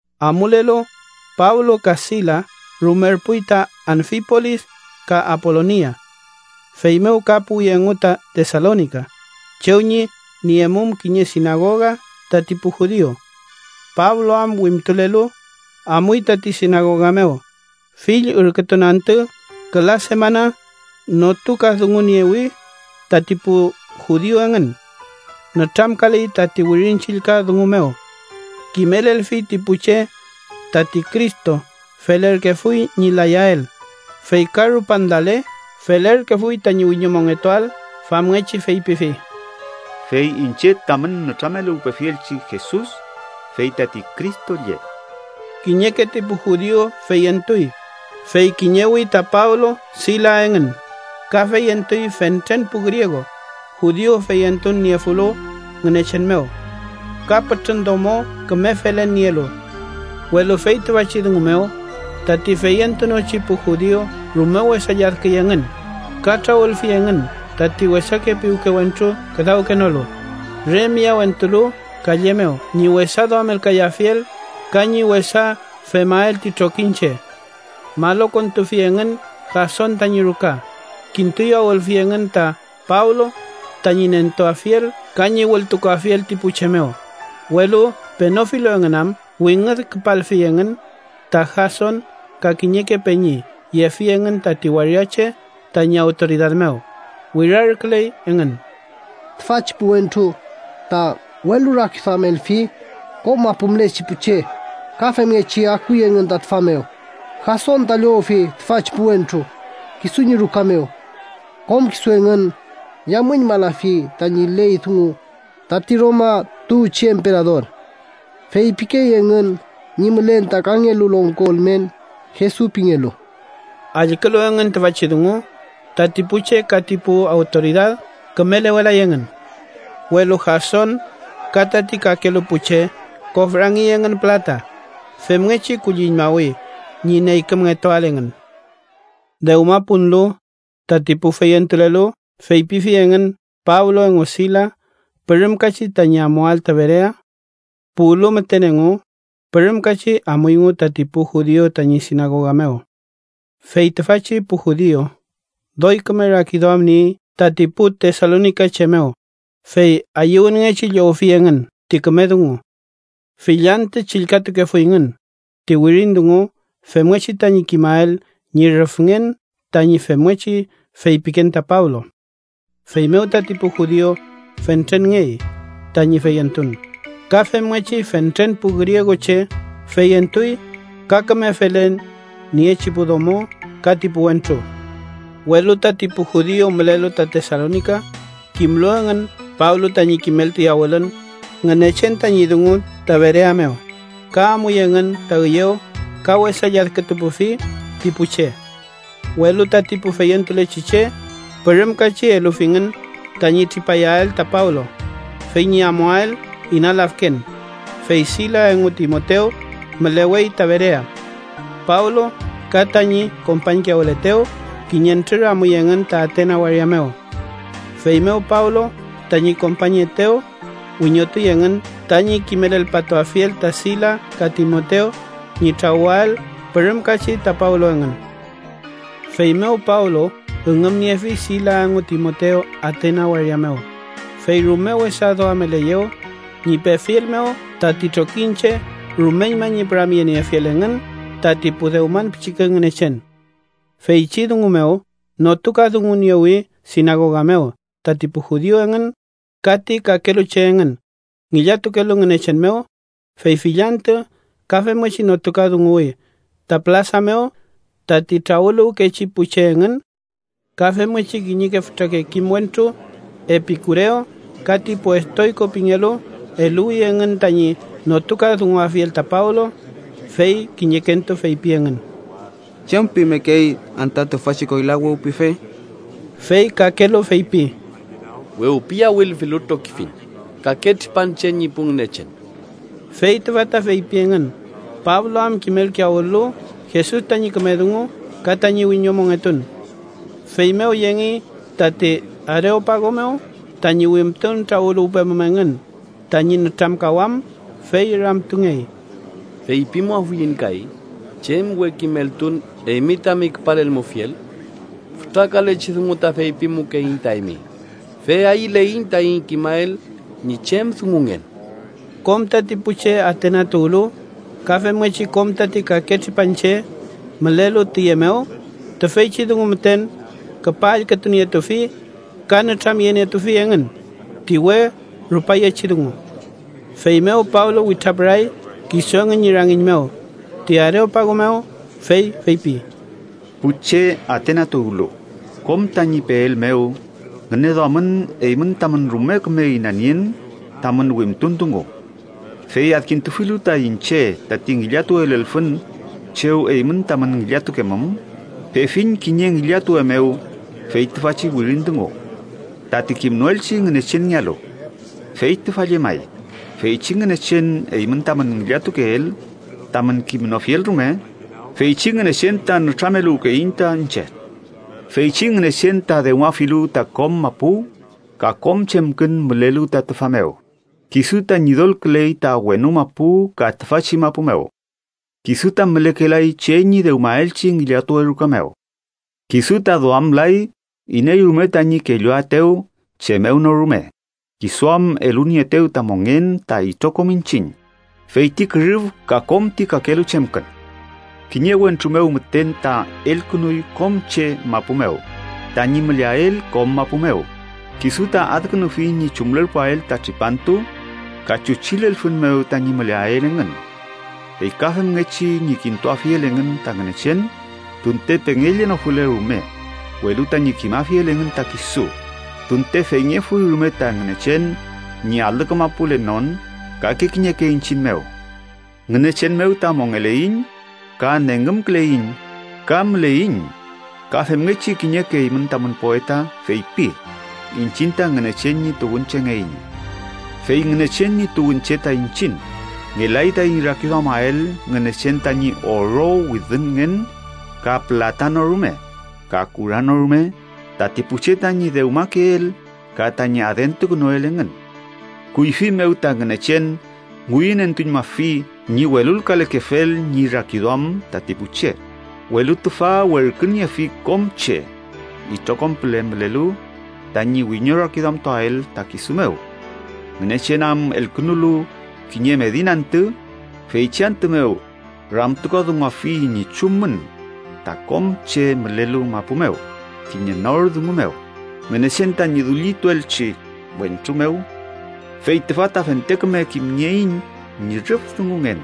Amulelu, Pablo ka Silas rumerpuy ta Anfipolis ka Apolonia. Feymew ka puwi engu ta Tesalonika, chew ñi niemum kiñe sinagoga tati pu judiu. Pablo am wimtulelu, amuy tati sinagoga mew, fill ürkütun antü küla semana notukadunguniewi tati pu judiu engün. Nütramkaley tati Wirin Chillka dungu mew. Kimelelfi ti pu che tati Cristo felerkefuy ñi layael, fey ka rupan lale, felerkefuy tañi wiñomongetuael. Famngechi feypifi: “Fey iñche tamün nütrameluwpefielchi Jesus, fey tati Cristo lle.” Kiñeke ti pu judiu feyentuy, fey kiñewi ta Pablo Silas engün. Ka feyentuy fentren pu griegu judiu feyentun niefulu Ngünechen mew ka pütrün domo küme felen nielu. Welu fey tüfachi dungu mew tati feyentunochi pu judiu rume wesa lladküy engün ka trawülfi engün tati wesake piwke wentru küdawkenolu, re miyawentulu kalle mew ñi wesa duamelkayafiel ka ñi wesa femael ti trokiñche. Malokontufi engün Jason tañi ruka, kintuyawülfi engün ta Pablo tañi nentuafiel ka ñi wültukuafiel ti pu che mew, welu penofilu engün am, wingüd küpalfi engün ta Jason ka kiñeke peñi yefi engün tati waria che tañi awtoridad mew, wirarküley engün: —¡Tüfachi pu wentru ta welurakiduamelfi kom mapu mülechi pu che, ka femngechi akuy engün ta tüfa mew, Jason ta llowfi tüfachi pu wentru kisu ñi ruka mew! ¡Kom kisu engün yamüñmalafi tañi ley dungu tati Roma tuwchi emperador! ¡Feypikey engün ñi mülen ta kangelu longko ülmen, Jesus pingelu! Allkülu engün tüfachi dungu, tati pu che ka tati pu awtoridad kümelewelay engün. Welu Jason ka tati kakelu pu che kofrangey engün pülata, femngechi kulliñmawi ñi neykümngetuael engün. Dewma punlu, tati pu feyentulelu feypifi engün Pablo engu Silas pürümkachi tañi amuael ta Berea. Puwlu müten engu, pürümkachi amuyngu tati pu judiu tañi sinagoga mew. Fey tüfachi pu judiu doy küme rakiduam niey tati pu tesalonikache mew, fey ayüwünngechi llowfi engün ti küme dungu. Fill antü chillkatukefuyngün ti wirin dungu femngechi tañi kimael ñi rüfngen tañi femngechi feypiken ta Pablo. Feymew tati pu judiu fentrenngey tañi feyentun, ka femngechi fentren pu grieguche feyentuy ka küme felen niechi pu domo ka ti pu wentru. Welu tati pu judiu mülelu ta Tesalonika, kimlu engün Pablo tañi kimelkiyawülün Ngünechen tañi dungu ta Berea mew, ka amuy engün ta üyew ka wesa lladkülkapufi ti pu che. Welu tati pu feyentulechi che pürümkachi elufingün tañi tripayael ta Pablo fey ñi amuael ina lafken, fey Silas engu Timotew mülewey ta Berea. Pablo ka tañi kompañkiyawületew, kiñentrür amuy engün ta Atena waria mew. Feymew Pablo tañi kompañyeetew wiñotuy engün tañi kimelelpatuafiel ta Silas ka Timotew ñi trawüael pürümkachi ta Pablo engün. Feymew Pablo üngümniefi Silas engu Timotew Atena waria mew, fey rume wesa duameleyew ñi pefiel mew tati trokiñche rumeñma ñi püramyeniefiel engün tati pu dewman pichike ngünechen. Feychi dungu mew notukadunguniewi sinagoga mew tati pu judiu engün, ka ti kakelu che engün ngillatukelu Ngünechen mew, fey fill antü ka femngechi notukadunguwi ta pülasa mew tati trawüluwkechi pu che engün. Ka femngechi kiñeke fütrake kim wentru Epikurew ka ti pu Estoyko pingelu eluwi engün tañi notukadunguafiel ta Pablo, fey kiñekentu feypi engün: —¿Chem pimekey anta tüfachi koyla wewpife? Fey kakelu feypi: —Wewpiyawülfilu trokifiñ kake tripanche ñi pu ngünechen. Fey tüfa ta feypi engün Pablo am kimelkiyawül-lu Jesus tañi küme dungu ka tañi wiñomongetun. Feymew yengey tati Areopago mew tañi wimtun trawüluwpemum engün tañi nütramkawam, fey ramtungey: —¿Feypimuafuiñ kay chem we kimeltun eymi tami küpalelmufiel? Fütra kalechi dungu ta feypimukeiñ ta eymi, fey ayüleiñ taiñ kimael ñi chem dungungen. (Kom tati pu che Atena tuwlu, ka femngechi kom tati kake tripanche mülelu tüye mew tüfeychi dungu müten küpa allkütunietufi ka nütramyenietufi engün ti we rupayechi dungu.) Feymew Pablo witrapüray kisu engün ñi rangiñ mew ti Areopago mew, fey feypi: “Pu che Atena tuwlu, kom tañi peel mew, ngüneduamün eymün tamün rume küme inanien tamün wimtun dungu. Fey adkintufilu ta iñche tati ngillatuwe lelfün chew eymün tamün ngillatukemum, pefiñ kiñe ngillatuwe mew fey tüfachi wirin dungu: ‘Tati kimnoelchi Ngünechenngealu.’ Fey tüfa llemay, feychi Ngünechen eymün tamün ngillatukeel tamün kimnofiel rume, feychi Ngünechen ta nütrameluwkeyiñ ta iñche. “Feychi Ngünechen ta dewmafilu ta kom mapu ka kom chemkün mülelu ta tüfa mew, kisu ta Ñidolküley ta wenu mapu ka tüfachi mapu mew. Kisu ta mülekelay che ñi dewmaelchi ngillatuwe ruka mew. Kisu ta duamlay iney rume tañi kelluaetew chem mew no rume, kisu am elunieetew ta mongen ta itrokom iñchiñ fey ti kürüf ka kom ti kakelu chemkün. “Kiñe wentru mew müten ta elkünuy kom che mapu mew, tañi müleael kom mapu mew. Kisu ta adkünufi ñi chumlerpuael ta tripantu ka chuchi lelfün mew tañi müleael engün. Fey ka femngechi ñi kintuafiel engün ta Ngünechen, tunte pengekellenofule rume, welu tañi kimafiel engün ta kisu, tunte feyngefuy rume ta Ngünechen ñi alü kamapulenon kake kiñeke iñchiñ mew. Ngünechen mew ta mongeleiñ, ka nengümküleiñ ka müleiñ. Ka femngechi kiñeke eymün tamün poeta feypi: ‘Iñchiñ ta Ngünechen ñi tuwünchengeiñ.’ “Fey Ngünechen ñi tuwünche ta iñchiñ, ngelay taiñ rakiduamael Ngünechen tañi oro widünngen ka pülata no rume ka kura no rume tati pu che tañi dewmakeel ka tañi adentukünuel engün. Kuyfi mew ta Ngünechen ngüyünentuñmafi ñi welulkalekefel ñi rakiduam tati pu che, welu tüfa werküniefi kom che, itrokom püle mülelu tañi wiñorakiduamtuael ta kisu mew. Ngünechen am elkünulu kiñe medin antü, feychi antü mew ramtukadunguafi ñi chumün ta kom che mülelu mapu mew kiñe nor dungu mew, Ngünechen tañi dullintuelchi wentru mew. Fey tüfa ta fente küme kimnieiñ ñi rüf dungungen,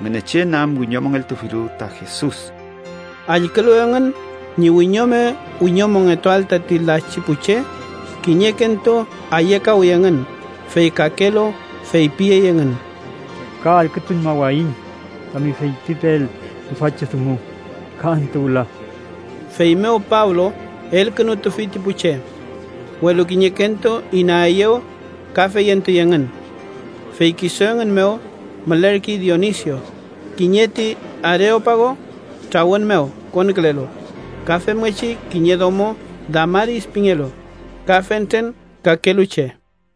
Ngünechen am wiñomongeltufilu ta Jesus.” Allkülu engün ñi wiñome wiñomongetuael tati lachi pu che, kiñekentu ayekawi engün, fey kakelu feypiyey engün: —Ka allkütuñmawayiñ tami feypipeel tüfachi dungu ka antü wüla. Feymew Pablo elkünutufi ti pu che. Welu kiñekentu inaeyew ka feyentuy engün. Fey kisu engün mew mülerkey Dionisio, kiñe ti Areopago trawün mew konkülelu, ka femngechi kiñe domo Damaris pingelu, ka fentren kakelu che.